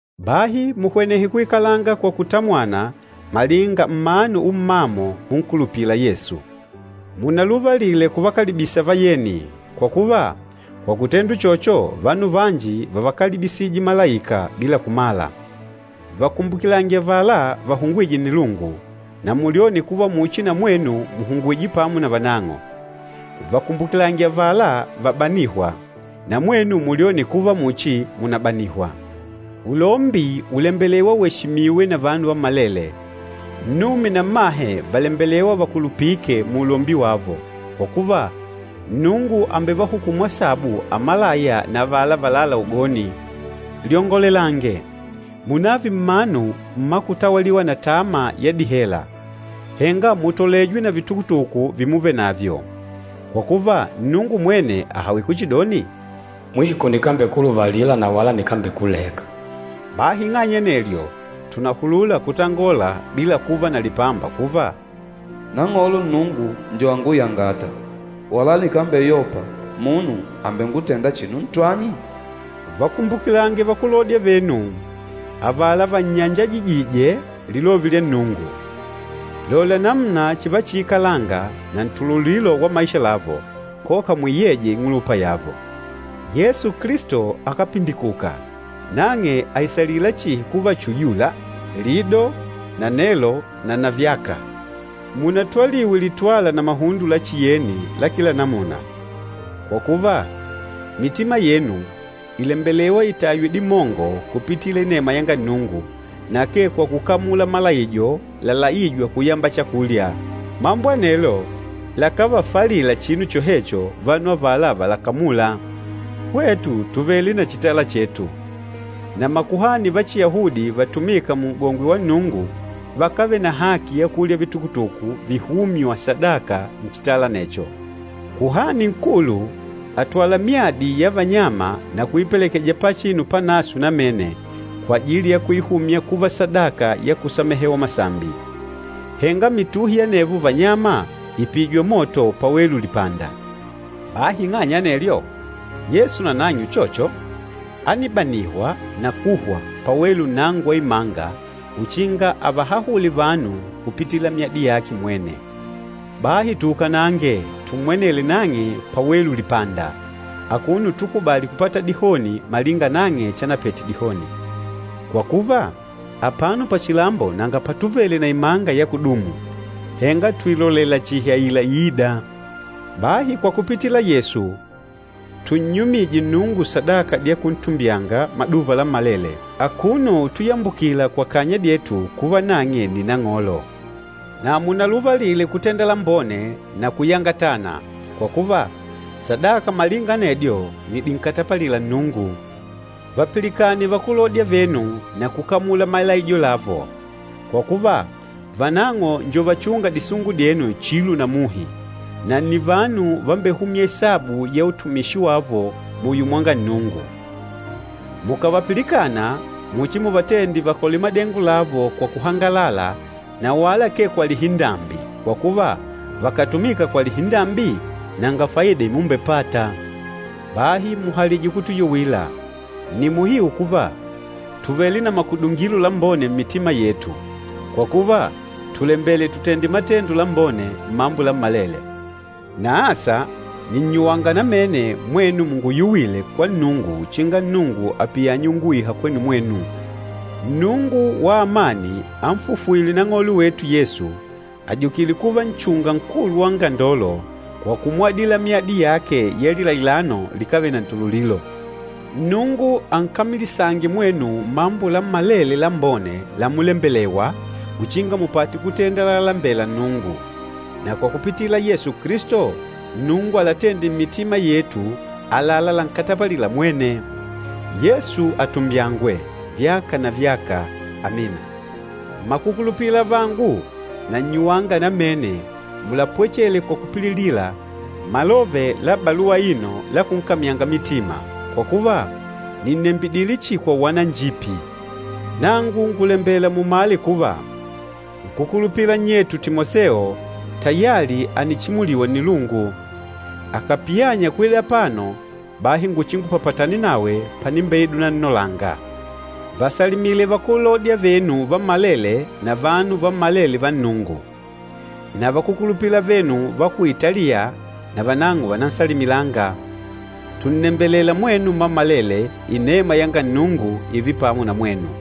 Bahi muhwenehe kuikalanga kwa kutamwana malinga mmanu ummamo munkulupîla Yesu. Munaluvalile kuvakalibisa vayeni, kwa kuva, kwa kutenda uchocho, vanu vanji vávakalibisije malaika bila kumala. Vakumbukilange avala vahungwîje nnilungu, na mulyone kuva muchi na mwenu mùhungwije pamo na vanang'o. Vakumbukilange avala vabanîhwa, na mwenu mulyone kuva muchi mùnabanihwa. Ulombi ùlembelewa weshimiwe na vanu vammalele, nnume na mmahe vàlembelewa vakulupike muulombi wavo, kwa kuva, Nnungu àmbevahukumu asabu amalaya na avala valâla ugoni. Lyongolelange, munààve mmanu mmakutawaliwa na tama ya dihela, henga mutolejwe na vitukutuku vimuvenavyo, kwa kuva Nnungu mwene àhawile kuchidoni, “Mwiko nikambekuluvalila na wala nikambekuleka.” Bahi ing'anya ya anelyo, tùnahulula kutangola bila kuva na lipamba kuva, “Nang'olo Nnungu njo anguyangâta, wala nikambeyopa. Munu àmbengutenda chinu ntwani?” Vakumbukilange vakúlodya venu, avala vannyanjajijîje lilove lya Nnungu. Lola namuna chivachiikalanga na ntululilo wa maisha lavo, koka muiyeje ing'ulupa yavo. Yesu Kilisto akápindikuka! Nang'e àisalila chihi kuva uyula, lido na nelo na navyaka. Munatwaliwe litwala na mahundo la chiyeni la kila namuna. Kwa kuva, mitima yenu ìlembelewa itaywe dimongo kupitila inema yanga Nnungu, na akee kwa kukamula malaijo lalaîjwa kuyamba chakulya. Mambo anelo lakávafalila chinu chohecho vanu avala valakamûla. Hwetu tùvele na chitala chetu, na makuhani va Chiyahudi vatumîka Mun'gongwe wa Nnungu vakávele na haki ya kulya vitukutuku vihûmywa sadaka nchitala anecho. Kuhani Nkulu àtwala myadi ya vanyama na kuipelekeja Pachinu Panaswe Namene kwajili ya kuihumya kuva sadaka ya kusamehewa masambi. Henga mituhi ya anevo vanyama ìpijwa moto pawelu lipanda. Bahi ing'anya ya anelyo, Yesu nanang'e uchocho, ánibanihwa na kuhwa pawelu nnango wa imanga uchinga avahahule vanu kupitila myadi yake mwene. Bahi tuukanange, tummwenele nang'e pawelu lipanda, akuno utukubali kupata dihoni malinga nang'e chanapete dihoni. Kwa kuva, apano pachilambo nanga patuvele na imanga ya kudumu, henga tùilolela chihi aila iîda. Bahi kwa kupitila Yesu, túnnyumìjè Nnungu sadaka dya kuntumbyanga maduva lammalele, akuno utuyambukila kwa kanya dyetu kuva nang'e nni Nang'olo. Na munaluvalile kutenda lambone na kuyangatana, kwa kuva, sadaka malinga anedyo nni dinkatapalîla Nnungu. Vàpilikane vakúlodya venu na kukamula malaijo lavo. Kwa kuva, vanang'o njo vachûnga disungu dyenu chilo na muhi, na nni vanu vambehûmya isabu ya utumishi wavo muyo mwanga Nnungu. Mukàvapilikana, muchimuvatende vakole madengo lavo kwa kuhangalala na wala akee kwa lihindambi, kwa kuva, vakàtumika kwa lihindambi, nanga faida imumbepata. Bahi muhalije kutuyuwila. Nni muhiu kuva, tùvele na makudungilo lambone mmitima yetu, kwa kuva tùlembela tutende matendo lambone mmambo lammalele. Na asa nìnnyuwanga namene mwenu munguyuwile kwa Nnungu uchinga Nnungu apiyanye unguiha kwenu mwenu. Nnungu wa amani ànfufwile Nang'olo wetu Yesu, ajukîle kuva Nchunga Nkulu wa angandolo kwa kumwadila myadi yake ya lilailano likávele na ntululilo. Nnungu ankamilisange mwenu mmambo lammalele lambone lamulembelewa uchinga mupate kutênda lalembêla Nnungu. Na kwa kupitila Yesu Kilisto, Nnungu alatende mmitima yetu àlalá lankatapalîla mwene. Yesu atumbyangwe, vyaka na vyaka! Amina. Mmakukulupila avangu, nannyuwanga namene mulapwechele kwa kupililila malove la baluwa aino la kunkamyanga mitima, kwa kuva, nìnnembidile chihi kwa uwananjipi. Nangu ngùlembela mumale kuva, nkúkulupila nnyetu Timoseo tayali ànichimuliwa nnilungu. Akàpiyanya kwida apano, bahi nguchingupapatane nawe panimbeida unannolanga. Vasalimile vakúlodya venu vammalele na vanu vammalele va Nnungu. Na vakúkulupila avenu va ku Italiya na vanang'o vànansalimilanga. Tùnnembelela mwenu mmammalele inema yanga Nnungu ììve pamo na mwenu.